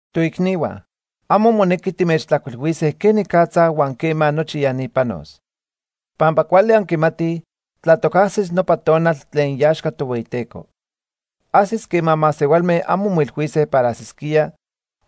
Toicnihua, amo monequi timechtlajcuilhuise quenicatza huan quema nochi ya ni panos. Pampa cuali anquimatij tlatoc ajsis nopa tonal tlen iaxca Tohueyiteco. Ajsis quema masehualme amo moilhuise para ajsisquía,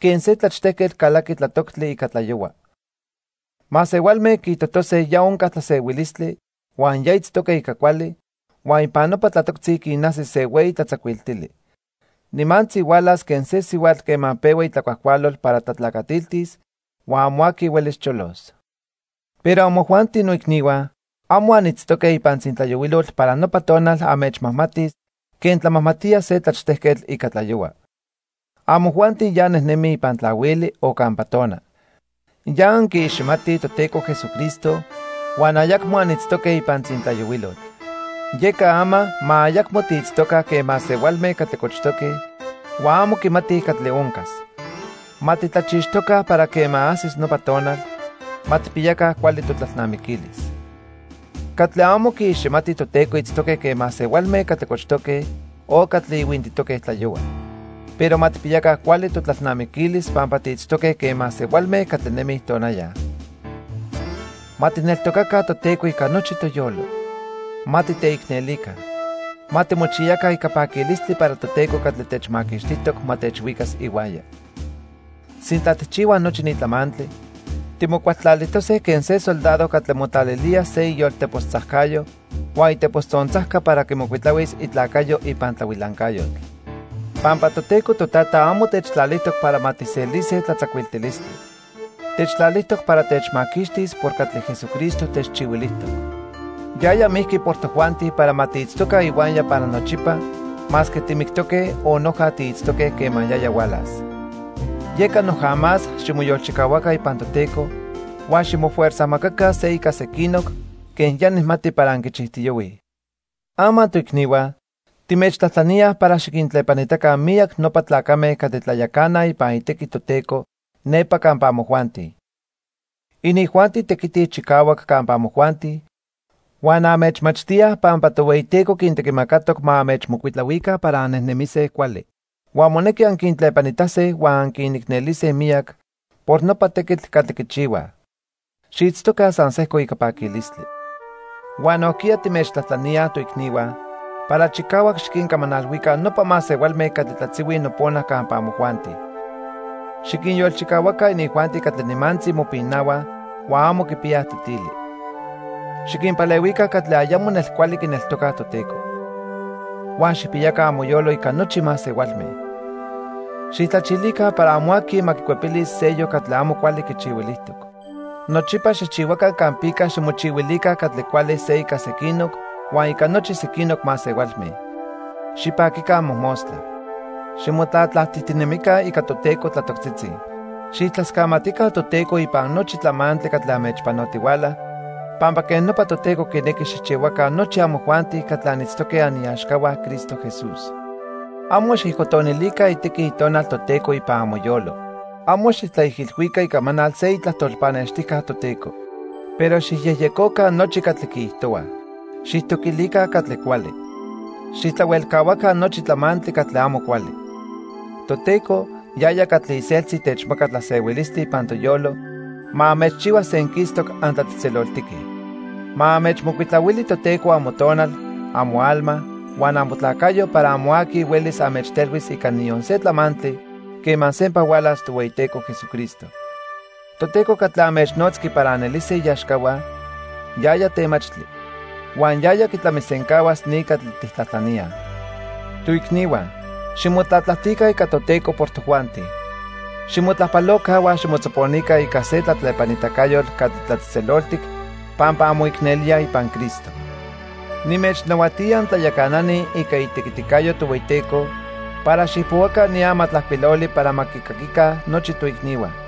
quen se tlachtejquetl calaqui tlatoctli ica tlayohua. Masehualme quiijtojtose ya onca tlasehuilistli huan ya itztoque ica cuali, huan ipan nopa tlatoctzi quinajsis se hueyi tlatzacuiltili. Nimantzi hualas quen se sihuatl quema pehua itlacuajcualol para tlatlacatiltis huan amo aqui huelis cholos. Pero amojuanti noicnihua, amo anitztoque ipan tzintlayohuilotl para nopa tonal anmechmajmati quen tlamajmatía se tlachtejquetl ica tlayohua. Amojuanti ya annejnemij ipan tlahuili o campa tona. Ya anquiiximatij Toteco Jesucristo huan ayacmo anitztoque ipan tzintlayohuilotl. Yeca ama ma ayacmo tiitztoca quen masehualme catli cochtoque huan amo quimatij catli oncas. Ma titlachixtoca para quema ajsis nopa tonal. Ma tijpiyaca cuali totlalnamiquilis. Catli amo quiiximatij Toteco itztoque quen masehualme catli cochtoque o catli ihuintitoque tlayohua. Pero ma tijpiyaca cuali totlalnamiquilis pampa tiitztoque quen masehualme catli nemij tonaya. Ma tijneltocaca Toteco ica nochi toyolo. Ma titeicnelica. Ma timochiyaca ica paquilistli para Toteco catli techmaquixtijtoc ma techhuicas ihuaya. Sintla tijchihuaj nochi ni tlamantli, timocualtlalijtose quen se soldado catli motlalilía se iyoltepos tzajcayo huan itepos tzontzajca para quimocuitlahuis itlacayo ipan tlahuilancayotl. Pampa Toteco Totata amo techtlalijtoc para ma tijselise tlatzacuiltilistli. Techtlalijtoc para techmaquixtis por catli Jesucristo techchihuilijtoc. Yaya mijqui por tojuanti para ma tiitztoca ihuaya para nochipa masque timictoque o noja tiitztoque quema yaya hualas. Yeca noja más ximoyolchicahuaca ipan Toteco huan ximofuerzajmacaca se ica sequinoc quen ya nijmati para anquichijtiyohuij. Ama toicnihua, timechtlajtlaníaj para xiquintlepanitaca miyac nopa tlacame catli tlayacanaj ipan itequi Toteco nepa campa amojuanti. Inijuanti tequitij chicahuac campa amojuanti huan anmechmachtíaj pampa Tohueyiteco quintequimacatoc ma anmechmocuitlahuica para annejnemise cuali. Huan monequi anquintlepanitase huan anquinicnelise miyac por nopa tequitl catli quichihuaj. Xiitztoca san sejco ica paquilistli. Huan nojquiya timechtlajtlaníaj, toicnihua, para chicahuac xiquincamanalhuica nopa masehualme catli tlatzihuij nopona campa amojuanti. Xiquinyolchicahuaca inijuanti catli nimantzi mopinahuaj huan amo quipiyaj tetili. Xiquinpalehuica catli ayamo nelcuali quineltocaj Toteco. Huan xijpiyaca amoyolo ica nochi masehualme. Xijtlachilica para amo aqui ma quicuepilis seyoc catli amo cuali quichihuilijtoc. Nochipa xijchihuaca campica ximochihuilica catli cuali se ica sequinoc huan ica nochi sequinoc masehualme. Xipaquica mojmostla. Ximotlatlajtijtinemica ica Toteco tlatoctzitzi. Xijtlascamatica Toteco ipan nochi tlamantli catli anmechpanotihuala pampa quej nopa Toteco quinequi xijchihuaca nochi amojuanti catli anitztoque aniaxcahua Cristo Jesús. Amo xijcotonilica itequi Itonal Toteco ipan amoyolo. Amo xijtlaijilhuica icamanal se itlajtol pannextijca Toteco. Pero xijyejyecoca nochi catli quiijtohuaj. Xijtoquilica catli cuali. Xijtlahuelcahuaca nochi tlamantli catli amo cuali. Toteco, yaya catli iseltzi techmaca tlasehuilistli ipan toyolo, ma anmechchihua senquistoc antlatzejtzeloltique. Ma anmechmocuitlahuili Toteco amotonal, amoalma, huan amotlacayo para amo aqui huelis anmechtelhuis ica niyon se tlamantli quema sempa hualas Tohueyiteco Jesucristo. Toteco catli anmechnotzqui para anelise iaxcahua, yaya temachtli. Huan yaya quitlamisencahuas ni catli tijtlajtlaníaj. Toicnihua, ximotlatlajtica ica Toteco por tojuanti. Ximotlajpaloca huan ximotzoponica ica se tlatlepanitacayotl catli tlatzejtzeloltic pampa anmoicnelíaj ipan Cristo. Nimechnahuatía antlayacanani ica itequiticayo Tohueyiteco para xijpohuaca ni amatlajcuiloli para ma quicaquica nochi toicnihua.